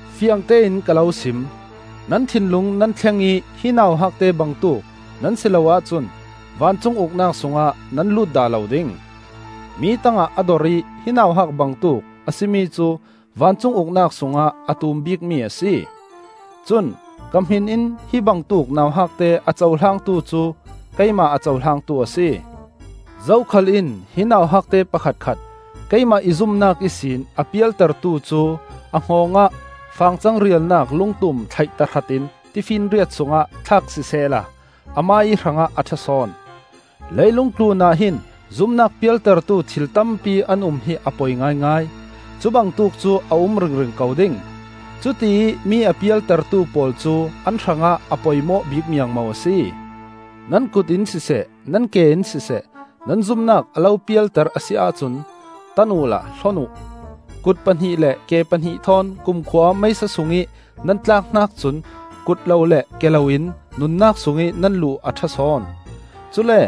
“Fiangtein ka lo sim: nan thinlung nan thleng ih hi nauhakte bangtuk nan si lo ahcun vancung Uknak sungah nan lut dah lo ding. Mi tangah a dor ih hi nauhak bangtuk a si mi cu vancung Uknak sungah a tum bikmi a si. Cun ka hmin in hi bangtuk nauhakte a cohlangtu cu keimah a cohlangtu a si. “Zokhal in hi nauhakte pakhatkhat keimah i zumnak ihsin a pialtertu cu a hngawng ah fangcang rialnak lungtum thlaih tahratin tifinriat sungah thlak sisehla amah ih hrangah a ṭha sawn. Leilung tlunah hin zumnak pialtertu thil tampi an um hi a poi ngaingai. Cubangtuk cu a um ringring ko ding; cutiih mi a pialtertu pawl cu an hrangah a poimawh bik miangmo a si. “Nan kut in siseh, nan ke in siseh, nan zumnak a lo pialter a si ahcun tan uhla hlon uh. Kut pahnih le ke pahnih thawn kumkhua meisa sungih nan tlak hnak cun kut lo le ke loin nunnak sungih nan luh a ṭha sawn. Cule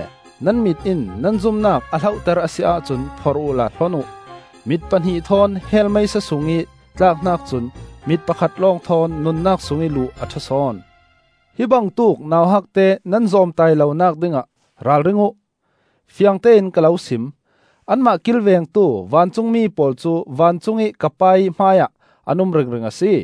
nan mit in nan zumnak a hlohter a si ahcun phorh uhla hlon uh. Mit pahnih thawn hell meisa sungih tlak hnak cun mit pakhat lawng thawn nunnak sungih luh a ṭha sawn. “Hi bangtuk nauhakte nan zawmtai lonak dingah ralring uh. Fiangtein ka lo sim: anmah kilvengtu vancungmi pawl cu vancungih ka Pa ih hmaiah an um ringring a si.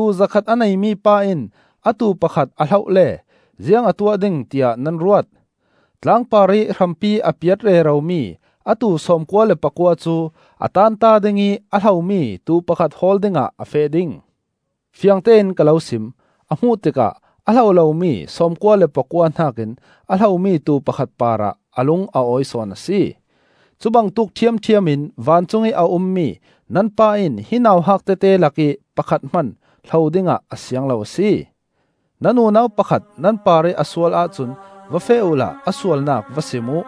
“Tuu zakhat a nei mipa in a tuu pakhat a hloh le ziang a tuah ding tiah nan ruat? Tlang parih hrampi a piat reromi a tuu sawmkua le pakua cu a taanta ding ih a hlomi tuu pakhat hawl dingah a feh ding. Fiangtein ka lo sim: a hmuh tikah a hlo lomi sawmkua le pakua hnakin a hlomi tuu pakhat parah a lung a awi sawn a si. Cubangtuk ṭhiamṭhiam in vancungih a ummi nan Pa in hi nauhaktete lakih pakhat hman hlo dingah a siang lo a si. “Nan unau pakhat nan parih a sual ahcun va feh uhla a sualnak va sim uh.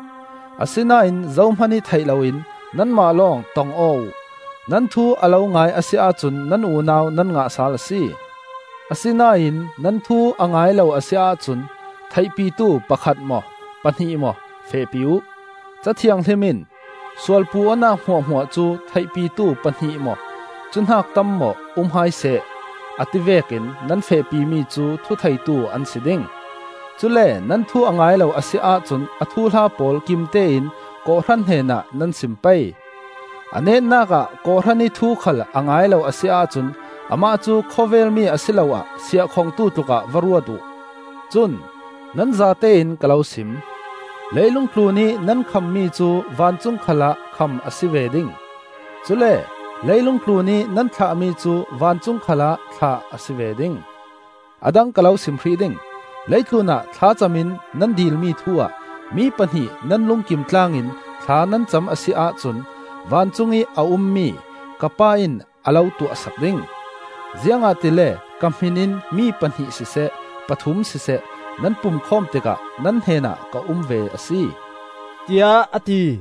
Asinain zohmanih theih loin nanmah lawng tong aw uh. Nan thu a lo ngai a si ahcun nan unau nan ngah sal a si. Asinain nan thu a ngai lo a si ahcun theihpitu pakhat maw pahnih maw fehpi uh. Ca Thianghlim in, “Sual puh awknak hmuahhmuah cu theihpitu pahnih maw, cuhnak tam maw um hai seh,” a ti vekin na fehpi mi cu thutheitu an si ding. Cule nan thu a ngai lo a si ahcun a thuhla pawl kimtein kawhhran hnenah nan sim pei. A netnak ah kawhhran ih thu khal a ngai lo a si ahcun amah cu khawvelmi a si lo ah siahkhongtu tlukah va ruat uh. “Cun nan zatein ka lo sim: leilung tlunih nan khammi cu vancung khalah kham a si ve ding; cule leilung tlunih nan thlahmi cu vancung khalah thlah a si ve ding. “A dang ka lo sim hrih ding: leitlun ah thlacam in nan dil mi thu ah mi pahnih nan lungkim tlang in thla nan cam a si ahcun vancungih a ummi ka Pa in a lo tuahsak ding. Ziangahtile ka hmin in mi pahnih siseh, pathum siseh, nan pumkhawm tikah nan hnenah ka um ve a si,” tiah a ti.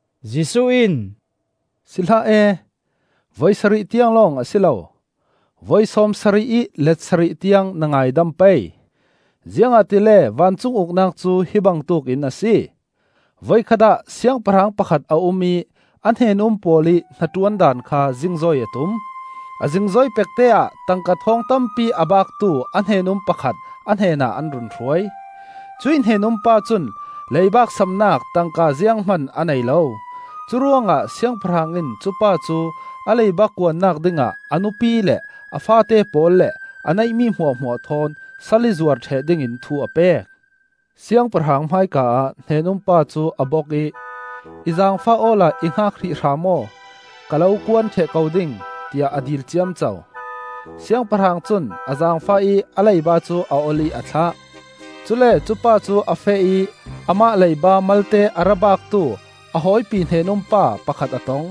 Jesuh in, “Si hlah ee, voi sarih tiang lawng a si lo; voi sawmsarih ih let sarih tiang na ngaidam pei; ziangahtile vancung Uknak cu hi bangtuk in a si. Voi khatah Siangpahrang pakhat a um ih a hnen-um pawl ih hnaṭuan daan kha zingzoi a tum. A zingzoi pekte ah tangka thawng tampi a baaktu a hnen-um pakhat a hnenah an run hruai. Cuih hnen-um pa cun leiba samnak tangka ziang hman a nei lo. Cu ruangah siangpahrang in cupa cu a leiba kuannak dingah a nupi le a faate pawl le a neihmi hmuahhmuah thawn salih zuar ṭheh dingin thu a pek. Siangpahrang hmaika ah hnen-um pa cu a bok ih, ‘I zaangfah awla i hngak hrih hram aw. Ka lo kuan ṭheh ko ding,’ tiah a dil ciamco. Siangpahrang cun a zaangfah ih a leiba cu a olh ih a thlah. “Cule cupa cu a feh ih amah leiba malte a rak baaktu a hawipi hnen-um pa pakhat a tong.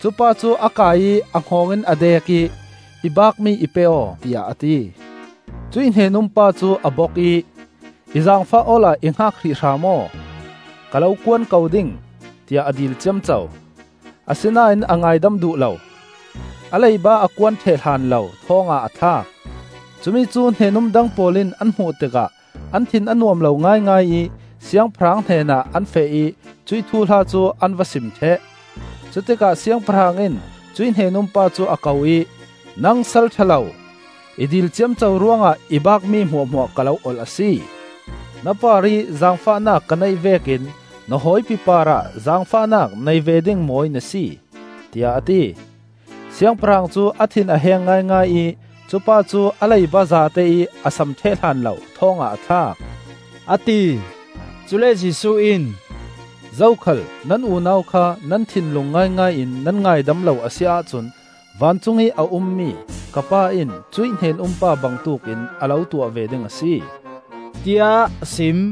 Cupa cu a kai ih a hngawng in a deek ih, ‘I baakmi i pe aw,’ tiah a ti. Cuih hnen-um pa cu a bok ih, ‘I zaangfah awla i hngak hrih hram aw. Ka lo kuan ko ding,’ tiah a dil ciamco. Asinain a ngaidam duh lo. A leiba a kuan ṭheh hlan lo thawngah a thlak. Cumi cu hnen-um dang pawl in an hmuh tikah an thin a nuam lo ngaingai ih siangpahrang hnenah an feh ih cuih thuhla cu an va sim ṭheh. Cutikah siangpahrang in cuih hnen-um pa cu a ko ih, ‘Nang sal ṭha lo. I dil ciamco ruangah i baakmi hmuahhmuah ka lo olh a si. Na parih zaangfahnak ka neih vekin na hawipi parah zaangfahnak nei ve ding mawi na si,’ tiah a ti. Siangpahrang cu a thin a heng ngaingai ih cupa cu a leiba zate ih a sam ṭheh hlan lo thawngah a thlak,” a ti. Cule Jesuh in, “Zokhal nan unau kha nan thinlung ngaingai in nan ngaidam lo a si ahcun vancungih a ummi ka Pa in cuih hnen-um pa bangtuk in a lo tuah ve ding a si,” tiah a sim.